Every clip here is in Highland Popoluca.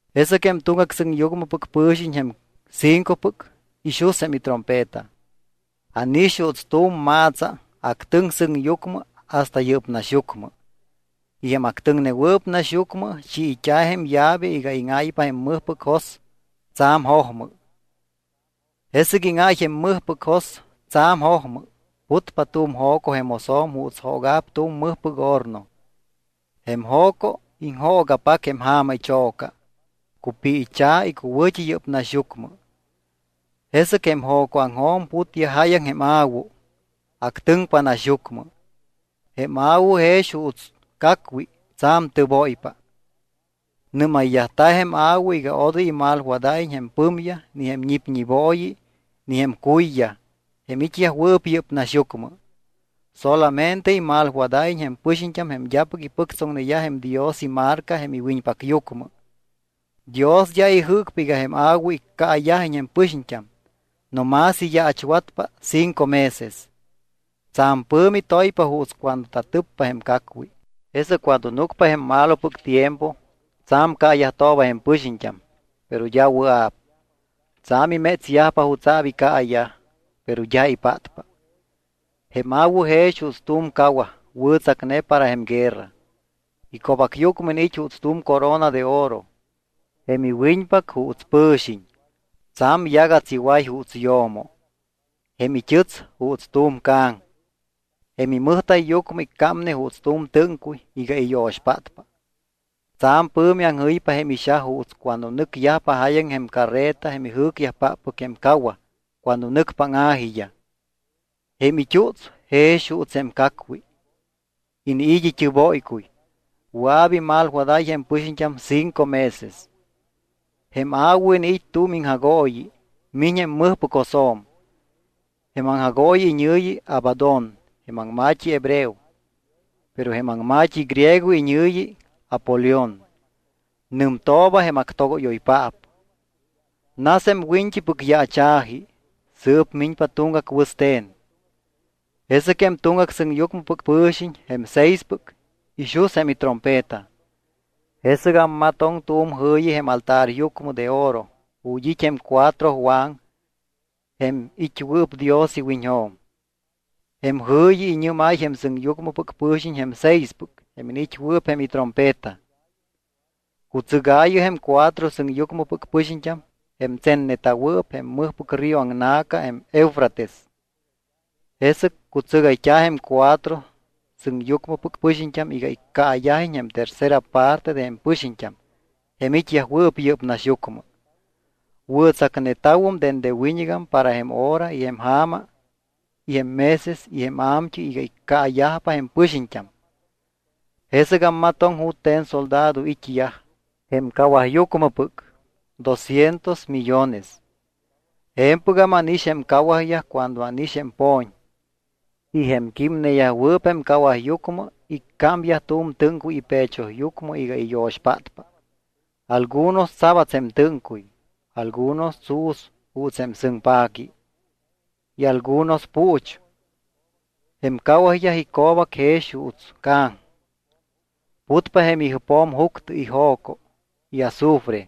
Jesɨc jém tuŋgac sɨŋyucmɨpɨc pɨ̱xiñ jém cincopɨc ixus jém itrompeta. Ánix juuts tu̱m ma̱tsa actɨŋ sɨŋyucmɨ hasta yɨ́p naxyucmɨ. Y jém actɨŋnewɨɨp naxyucmɨ chiit́a̱ jém llave iga íŋáypa jém mɨjpɨc jos tsa̱m jojmɨ. Jesɨc íŋáy jém mɨjpɨc jos tsa̱m jojmɨ. Putpa tu̱m jo̱co jém josjo̱m juuts jooga̱p tu̱m mɨjpɨc horno. Jém jo̱co iŋjooga̱pac jém ja̱ma icho̱ca, cupiicha̱ icuwɨ̱t́i yɨ́p naxyucmɨ. Jesɨc jém jo̱coaŋjo̱m putyaj jáyaŋ jém a̱wu. Actɨŋpa naxyucmɨ. Jém a̱wu jex juuts cacwi tsa̱m tɨbóypa. Nɨ́mayyajta̱ jém a̱wu iga odoy imalwadáyiñ jém pɨmyaj ni jém ñipñibooyi ni jém cuyyaj jém it́yajwɨɨp yɨ́p naxyucmɨ. Solamente imalwadáyiñ jém pɨxiñt́am jém d́apɨc ipɨctsoŋneyaj jém Dios imarca jém iwiñpacyucmɨ. Dios d́a ijɨ́cpa iga jém a̱wu iccaayajiñ jém pɨxiñt́am no más iyaachwatpa cinco meses. Tsa̱m pɨ̱mi toypa juuts cuando tatɨppa jém cacwi. Jesɨc cuando núcpa jém malopɨc tiempo, tsa̱m caayajtooba jém pɨxiñt́am, pero d́a wɨa̱p. Tsa̱m imétsyajpa jutsa̱p icaayaj, pero d́a ipátpa. Jém a̱wu jex juuts tu̱m cawaj wɨ̱tsacne para jém guerra. Ico̱bacyucmɨ iniit́ juuts tu̱m corona de oro. Jém iwiñpac juuts pɨ̱xiñ. Tsa̱m yagats iway juuts yo̱mo. Jém it́ɨts juuts tu̱m ca̱ŋ. Jém imɨjta̱yyucmɨ iccámne juuts tu̱m tɨ́ŋcuy iga iyo̱xpátpa. Tsa̱m pɨ̱mi aŋjɨypa jém ixaj juuts cuando nɨcyajpa jáyaŋ jém carreta jém ijɨ́cyajpáppɨc jém cawaj cuando nɨcpa áŋa̱jiyaj. Jém it́uts jex juuts jém cacwi. Iniit́ it́ɨbóycuy. Wɨa̱p imalwadáy jém pɨxiñt́am cinco meses. Jém a̱wu iniit́ tu̱m iŋjagooyi. Miñ jém mɨjpɨc josjo̱m. Jém aŋjagooyi iñɨ̱yi Abadón jém aŋma̱t́i hebreo, pero jém aŋma̱t́i griego iñɨ̱yi Apolión. Nɨmtooba jém actogóyoypaap. Nas jém wiñt́ipɨc yaacha̱ji. Sɨɨp miñpa tuŋgac wɨste̱n. Jesɨc jém tuŋgac sɨŋyucmɨpɨc pɨ̱xiñ, jém seispɨc, ixus jém itrompeta. Jesɨc ammatoŋ tu̱m jɨ̱yi jém altaryucmɨ de oro ju̱t́ it́ jém cuatro waŋ jém it́wɨɨp Dios iwiñjo̱m. Jém jɨ̱yi iñɨ́máy jém sɨŋyucmɨpɨc pɨ̱xiñ jém seispɨc jém iniit́wɨɨp jém itrompeta: —Cutsɨgaayɨ jém cuatro sɨŋyucmɨpɨc pɨxiñt́am jém tsenneta̱wɨɨp jém mɨjpɨc río aŋna̱ca jém Eufrates. Jesɨc cutsɨgayt́a̱ jém cuatro sɨŋyucmɨpɨc pɨxiñt́am iga iccaayajiñ jém tercera parte de jém pɨxiñt́am jém it́yajwɨɨp yɨ́p naxyucmɨ. Wɨ̱tsacneta̱wum dende wiñɨgam para jém hora y jém ja̱ma y jém meses y jém a̱mt́ɨy iga iccaayajpa jém pɨxiñt́am. Jesɨc ammatoŋ jute̱n soldado it́yaj, jém cawajyucmɨpɨc, doscientos millones. Je̱mpɨgam ánix jém cawajyaj cuando ánix jém po̱ñ. Y jém químneyajwɨɨp jém cawajyucmɨ iccámyaj tu̱m tɨ́ŋcuy ipechoyucmɨ iga iyo̱xpátpa. Algunos tsabats jém tɨ́ŋcuy, algunos tsu̱s juuts jém sɨŋpaqui, y algunos puuch. Jém cawajyaj ico̱bac jex juuts ca̱ŋ. Putpa jém ijɨpjo̱m juctɨ y jo̱co y azufre.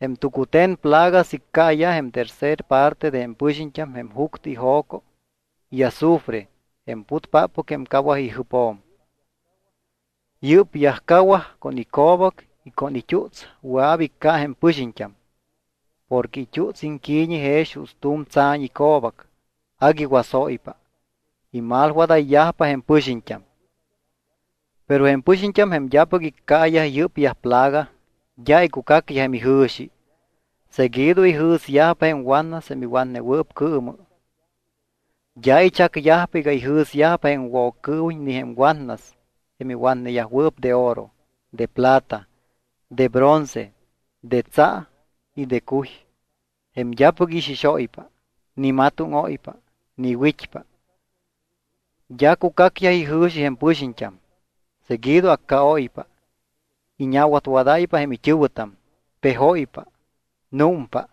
Jém tucute̱n plagas iccaayaj jém tercer parte de jém pɨxiñt́am jém juctɨ y jo̱co y azufre jém putpáppɨc jém cawaj ijɨpjo̱m. Yɨ́pyaj cawaj con ico̱bac y con it́uts wɨa̱p icca jém pɨxiñt́am. Porque it́uts iŋqui̱ñi jex juuts tu̱m tsa̱ñ ico̱bac agui wasóypa. Imalwadayyajpa jém pɨxiñt́am. Pero jém pɨxiñt́am jém d́apɨc iccaayaj yɨ́pyaj plaga d́a icucacyaj jém ijɨ̱xi. Seguido ijɨ̱syajpa jém watnas jém iwatnewɨɨp cɨɨmɨ. D́a ichacyajpa iga ijɨ̱syajpa jém Woccɨɨwiñ ni jém watnas jém iwatneyajwɨɨp de oro, de plata, de bronce, de tsa y de cuy, jém d́apɨc ixixóypa, ni matóŋóypa, ni wit́pa. D́a cucacyaj ijɨ̱xi jém pɨxiñt́am. Seguido accaóypa, iñawatwadáypa jém it́ɨ̱wɨtam, pejóypa, númpa.